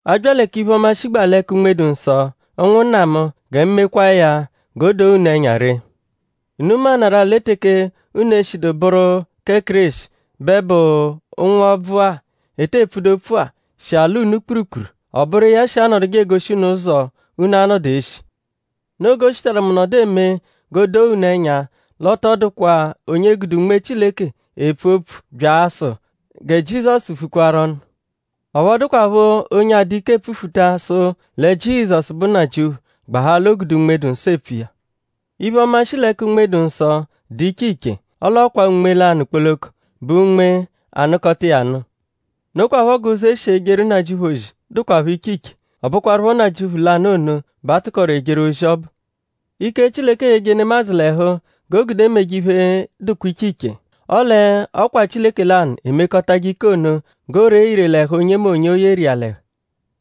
A bya lẹ k'iphe-ọma, shigbaa l'ẹka Unme-dụ-Nsọ; ụnwunna mu; gẹ mu mekwaa ya g'o doo unu ẹnya ree. Unu maanarụ-a lẹ teke unu eshidu bụru kẹ Kéreshi bẹ bụ ụnwu-ọbvu-a, ete pfudu opfu-a shi alọ unu kpurukpuru. Ọ bụru iya shi anọduje egoshi unu ụzo unu a-nọdu eshi. Noo g'o shitaru mu nọdu eme g'o doo unu ẹnya l'ọ tọ dụkwa onye gude Unme Chileke epfu opfu abya asụ: “Gẹ Jizọsu vukwaru ọnu.” Ọphu ọ dụkwapho onye adụ ike epfufuta sụ lẹ Jizọsu bụ Nnajịuphu gbahaa l'o gude Unme-dụ-Nsọ epfu iya. Iphe-ọma, shi l'ẹka Unme-dụ-Nsọ dụ iche iche; ọle ọ kwa Unme lanụ kpoloko bụ Unme, anụkota iya nụ. Nokwaphọ g'ụzo, e shi ejeru Nnajịuphu ozi dụkwapho iche iche; ọ bụkwarupho Nnajịuphu lanụ ono bẹ a tụkoru ejeru ozi ọbu. Ike, Chileke eyeje nemadzụ l'ẹhu g'o gude meje iphe, dụkwa iche iche. Ọle ọ kwaa Chileke lanụ emekọtaje ike ono g'o ree ire l'ẹhu onyemonye, o yeru iya l'ẹhu.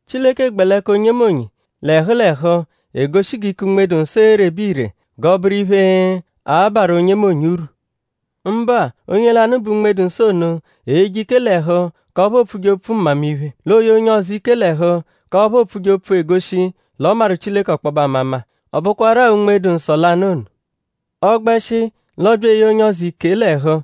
Chileke gbẹ l'ẹka onyemonye l'ẹhu l'ẹhu egoshi g'ike Unme-dụ-Nsọ erebe ire g'ọ bụru iphe, a-barụ onyemonye urwu. Mbụa; onye lanụ bẹ Unme-dụ-Nsọ ono eyeje ike l'ẹhu k'ọphu oopfuje opfu mmamiphe; l'o ye onye ọzo ike l'ẹhu k'ọphu oopfuje opfu, egoshije l'ọ maru Chileke ọkpobe amama. Ọ bụkwaru-a Unme-dụ-Nsọ lanụ ono. Ọ -gbẹshi l'ọobya eye onye ọzo ike l'ẹhu;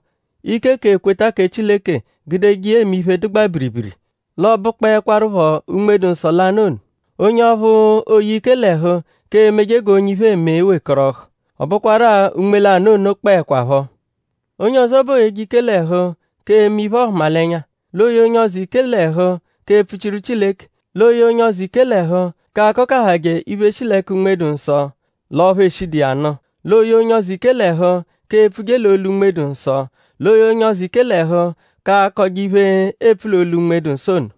ike k'ekweta kẹ Chileke gudeje iya eme iphe, dụgbaa biribiri; l'ọo bụkpoekwarupho Unme-dụ-Nsọ lanụ ono. Onye ọphu ooye ike l'ẹhu k'emeje g'onye iphe, eme wekọrohu; ọ bụkwaru-a Unme lanụ ono kpọekwapho. Onye ọzo bẹ ooyeje ike l'ẹhu k'eme iphe-ọhumalenya; l'ooye onye ọzo ike l'ẹhu k'epfuchiru Chileke; l'ooye onye ọzo ike l'ẹhu k'akọkahaje iphe, shi l'ẹka Unme-dụ-Nsọ l'ọphu eshidu iya nụ; l'ooye onye ọzo ike l'ẹhu k'epfuje l'olu Unme-dụ-Nsọ; l'ooye onye ọzo ike l'ẹhu k'akọje iphe, eepfu l'olu Unme-dụ-Nsọ ono.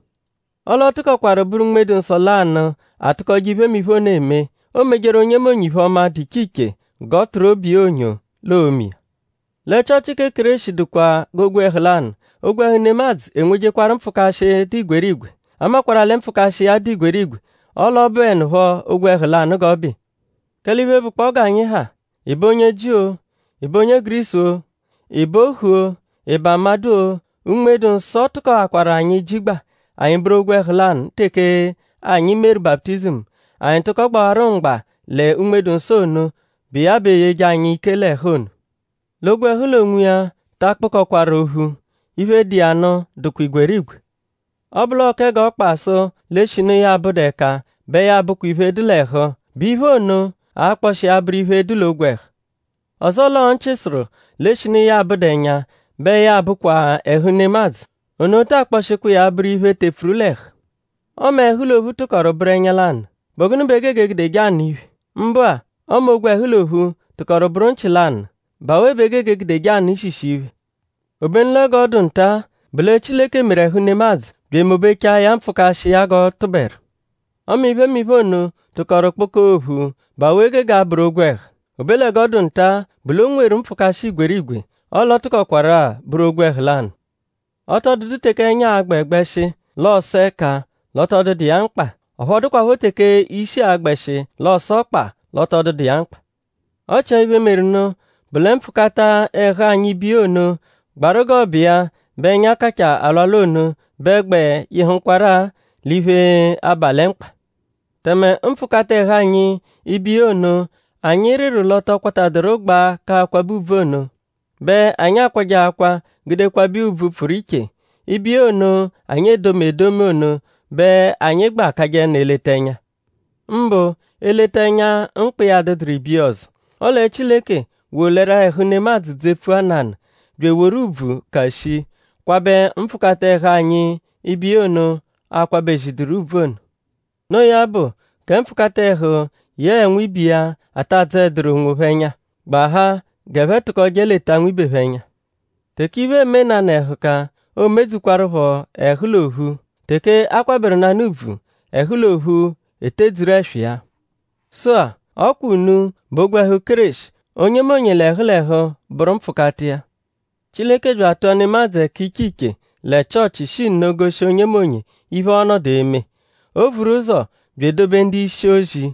Ọle ọ tụkokwaru bụru Unme-dụ-Nsọ lanụ atụkotaje iphemiphe ono eme. Oomejeru onyemonye iphe-ọma, dụ iche iche g'ọ tụru obu iya onyo l'oome iya. Lẹ Chịochi kẹ Kéreshi dụkwa g'ogwẹhu lanụ. Ogwẹhu nemadzụ enwejekwaru mpfụkashi, dụ igwerigwe. A makwarụ-a lẹ mpfụkashi iya dụ igwerigwe; ọle ọ bụenupho ogwẹhu lanụ g'ọ bụ iya. Kẹle iphe, bụkpoo g'anyi ha;?ị bụ onye Jiu-o;?ị bụ onye Gurisu-o;?ị bụ ohu-o;?ị bụ amadụ-o; Unme-dụ-Nsọ tụkoakwaru anyi jigba; anyi bụru ogwẹhu lanụ teke anyi meru baputizimu; anyi tụko gbawaru mgba lẹ Unme-dụ-Nsọ ono, bụ iya bẹ eyeje anyi ike l'ẹhu ono. L'ogwẹhu l'onwiya ta akpụkokwaru ophu. Iphe, dụ iya nụ dụkwa igwerigwe. Ọ -bụ l'ọo kẹ g'ọkpa sụ l'eshinu ya abụdu ẹka bẹ ya abụkwa iphe, dụ l'ẹhu;?bụ iphe ono a-kpọshi iya abụru iphe, dụ l'ogwẹhu? Ọzoo l'ọo nchị sụru l'eshinu ya abụdu ẹnya bẹ ya abụkwa ẹhu nemadzụ; ono taa kpọshikwa iya abụru iphe, tepfuru l'ẹhu. Ọme ẹhu l'ophu tụkoru bụru ẹnya lanụ;?bụ gụnu bẹ e gege egudeje anụ iphe? Mbụa ọme ogwẹhu l'ophu tụkoru bụru nchị lanụ;?bụ awe bẹ e gege egudeje anụ ishishi iphe? Obenu lẹ g'ọ dụ nta-a bụ lẹ Chileke meru ẹhu nemadzụ bya emobechaa ya mpfụkashi iya g'ọ tụberu. Ọme iphemiphe ono tụkoru kpụkoo ophu;?bụ awe gege abụru ogwẹhu? Obe lẹ g'ọ dụ nta-a bụ l'o nweru mpfụkashi igwerigwe; ọle ọ tụkokwaru-a bụru ogwẹhu lanụ. Ọ tọ dụdu teke ẹnya a-gbẹ gbẹshi l'ọ sụ ẹka l'ọ tọ dụdu iya mkpa. Ọphu ọ dụkwapho teke ishi a-gbẹshi l'ọosu ọkpa l'ọ tọ dụdu iya mkpa. Ọ chia iphe, meru nụ bụ lẹ mpfụkata ẹhu anyi ibiya ono, gbaru g'ọ bụ iya bẹ ẹnya kachaa alwalwa ono bẹ gbẹ yịhukwaru-a l'iphe, aba lẹ mkpa. Tẹme mpfụkata ẹhu anyi ibiya ono, anyi rịru l'ọ tọ kwataduru gbaa k'akwabẹ ùbvù ono bẹ anyi akwajẹ akwa gude kwabẹ iya ùbvù, pfụru iche. Ibiya ono, anyi edomi edomi ono bẹ anyi gbẹ akajẹnu eleta ẹnya; mbụ eleta ẹnya, mkpa iya adụduru ibiya ọzo. Ọle Chileke wolẹru-a ẹhu nemadzụ dzepfua nanụ; bya eworu ùbvù, ka shii kwabẹ mpfụkata ẹhu anyi ibiya ono, aakwabẹ-ziduru ùbvù ono. Noo ya bụ; gẹ mpfụkata ẹhu yẹe nwibe iya ata adzọeduru onwophẹ ẹnya; gbahaa g'ẹphe tụkoje leta nwibe phẹ ẹnya. Teke iphe eme nanụ ẹhuka; oomedzukwaruphọ ẹhu l'ophu. Teke a kwabẹru nanụ ùbvù; ẹhu l'ophu etedzuru ẹswa iya. Sụ-a; ọ kwa unu bụ ogwẹhu Kéreshi; onyemonye l'ẹhu l'ẹhu bụru mpfụkata iya. Chileke bya atụa nemadzụ ẹka iche iche lẹ Chịochi shi nno goshi onyemonye iphe, ọo-nọdu eme. O vuru ụzo bya edobe ndu-ishi-ozi;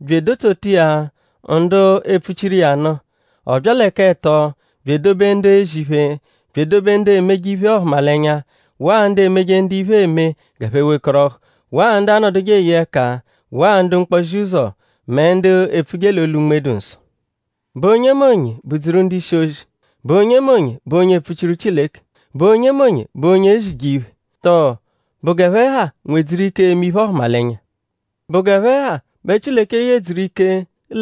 bya edotsota iya ndu epfuchiru iya nụ. Ọ bya lẹ k'ẹto bya edobe ndu ezi iphe; bya edobe ndu emeje iphe-ọhumalenya; waa ndu emeje ndu iphe eme g'ẹphe wekọrohu; waa ndu anọduje eye ẹka; waa ndu mkpozi-ụzo; mẹ ndu epfuje l'olu Unme-dụ-Nsọ. ?Bụ onyemonye bụ-dzuru ndu-ishi-ozi??Bụ onyemonye bụ onye epfuchiru Chileke??Bụ onyemonye bụ onye ezije iphe? Tọo?bụ g'ẹphe ha nwedzuru ike eme iphe-ọhumalenya? ?Bụ g'ẹphe ha bẹ Chileke yedzuru ike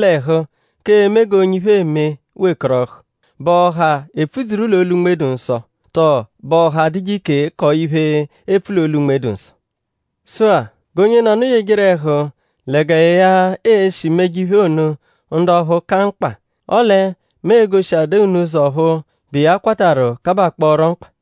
l'ẹhu k'eme g'onye iphe eme wekọrohu??Bụ ọha epfudzuru l'olu Unme-dụ-Nsọ? Tọo?bụ ọha adụje ike kọo iphe, eepfu l'olu, Unme-dụ-Nsọ? Sụ-a; g'onyenọnu yejeru ẹhu lẹ gẹ ya e-shi meje iphe ono ndu ọphu ka mkpa; ọle mu e-goshiadaa unu ụzo ọphu bụ iya kwatarụ kabakpọoro mkpa.